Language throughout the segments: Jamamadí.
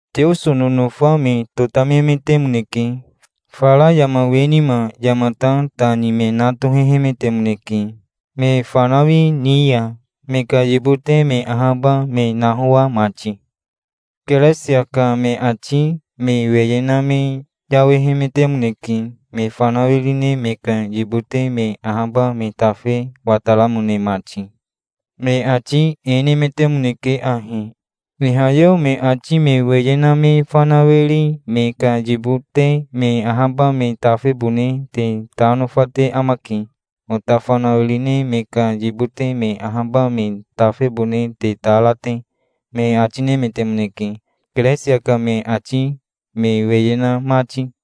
Teoso nonofa me totamemetemoneke. Fara yama we nima yamata ta ni me na tohehemetemoneke me fanawi ni ya, me ka yibote me ahaba me nahoa mati. Keresia ka me ati me weye na me yawehemetemoneke, me fanawiri me ka yibote me ahaba me tafe wataramone mati. Me ati e nemetemoneke ahi: "Ihayeo me ati me weye na me fanawiri me ka yibote me ahaba me tafebone te ta nofate amake, ota fanawiri me ka yibote me ahaba me tafebone te ta ra te", me ati nemetemoneke, Keresia ka me ati me weye na mati.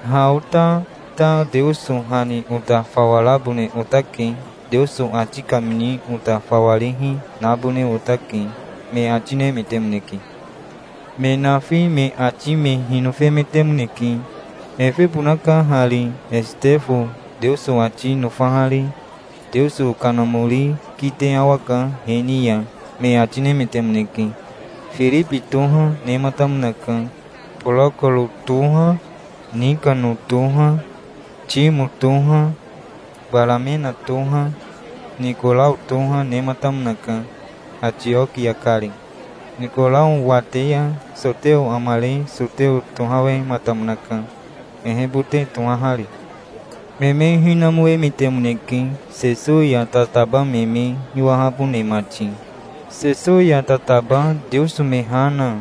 Ha ota ta Teoso ha ni ota fawa rabone otake. Teoso ati kamini ota fawarihi, nabone otake", me ati nemetemoneke. Me nafi me ati me hinofemetemoneke. "Efebonaka hari Esitefo, Teoso ati nofahari. Teoso Kanamori kite awaka he ni ya", me ati nemetemoneke. Firibi toha nematamonaka. Borokoro toha, Nikano toha, Timo toha, Baramena toha, Nikorao toha, nematamonaka, Atiokia kari. Nikorao wate ya soteo amare soteo tohawematamonaka, ehebote tohahari. Me me hinamoemetemoneke Sesowi ya tataba me me hiwahabone mati. Sesowi ya tataba Teoso me ha na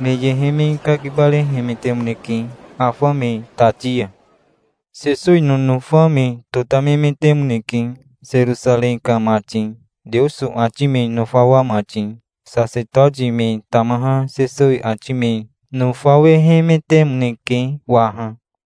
me yehe me kakibarehemetemoneke afa me tati ya. Sesowi nonofa me totamemetemoneke, Serosarei ka mati, Teoso ati me nofawa mati. Sasetoti me tamaha Sesowi ati me nofawehemetemoneke waha.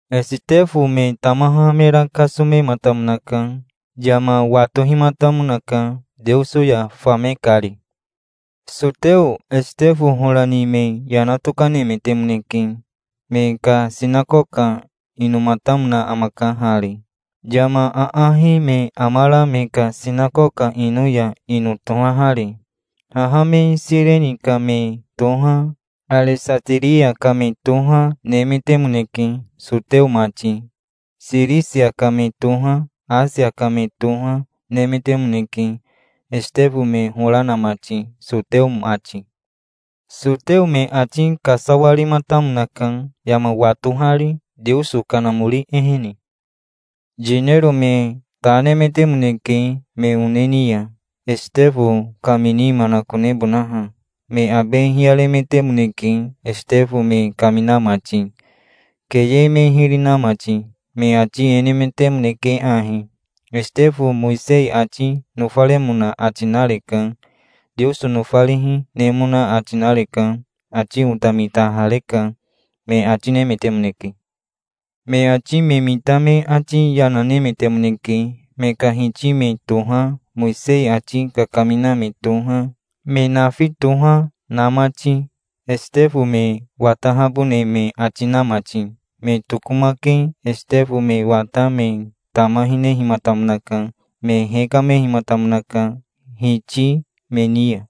Esitefo me tamaha mera kasomematamonaka. Yama watohimatamonaka Teoso ya fame kari. Soteo Esitefo hora ni me yana tokanemetemoneke. Me ka sinakoka inomatamona amaka hari, yama aahi me amara me ka sinakoka ino ya ino tohahari. Haha me Sireni ka me toha, Aresatiria ka me toha, nemetemoneke, soteo mati. Sirisia ka me toha, Asia ka me toha, nemetemoneke, Esitefo me hora na mati, soteo mati. Soteo me ati kasawarimatamonaka, yama watohari, Teoso Kanamori ehene. Yinero me ta nemetemoneke me one ni ya, Esitefo kamini manakonebonaha. Me abe hiyaremetemoneke, Esitefo me kamina mati, keye me hiri na mati. Me ati e nemetemoneke ahi: "Esitefo Mowisei ati nofaremona ati nareka. Teoso nofarihi, nemona ati nareka. Ati ota mitahareka", me ati nemetemoneke. Me ati me mita me ati yana nemetemoneke, me ka hiti me toha, Mowisei ati kakamina me toha, me nafi toha, na mati, Esitefo me watahabone me ati na mati. Me tokomake Esitefo me wata me tama hinehimatamonaka. Me hekamehimatamonaka hiti me ni ya.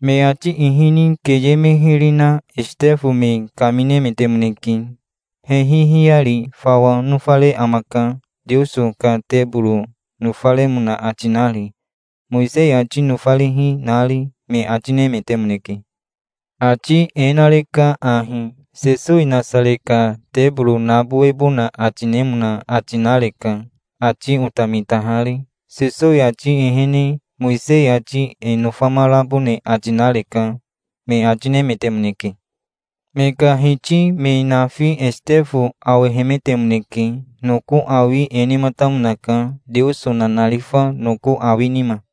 Me ati ihini keye me hiri na Esitefo me kaminemetemoneke. "Hehi hiyari fawa nofare amaka, Teoso ka teboro nofaremona ati nari, Mowisei ati nofarihi, nari", me ati nemetemoneke. Ati e nareka ahi. Sesowi Nasare ka teboro nabowebona ati nemona ati nareka, ati ota mitahari. Sesowi ati ehene Mowisei ati e nofamarabone ati nareka", me ati nemetemoneke. Me ka hiti me nafi Esitefo awehemetemoneke. Noko awi e nematamonaka, Teoso nanarifa noko awi nima.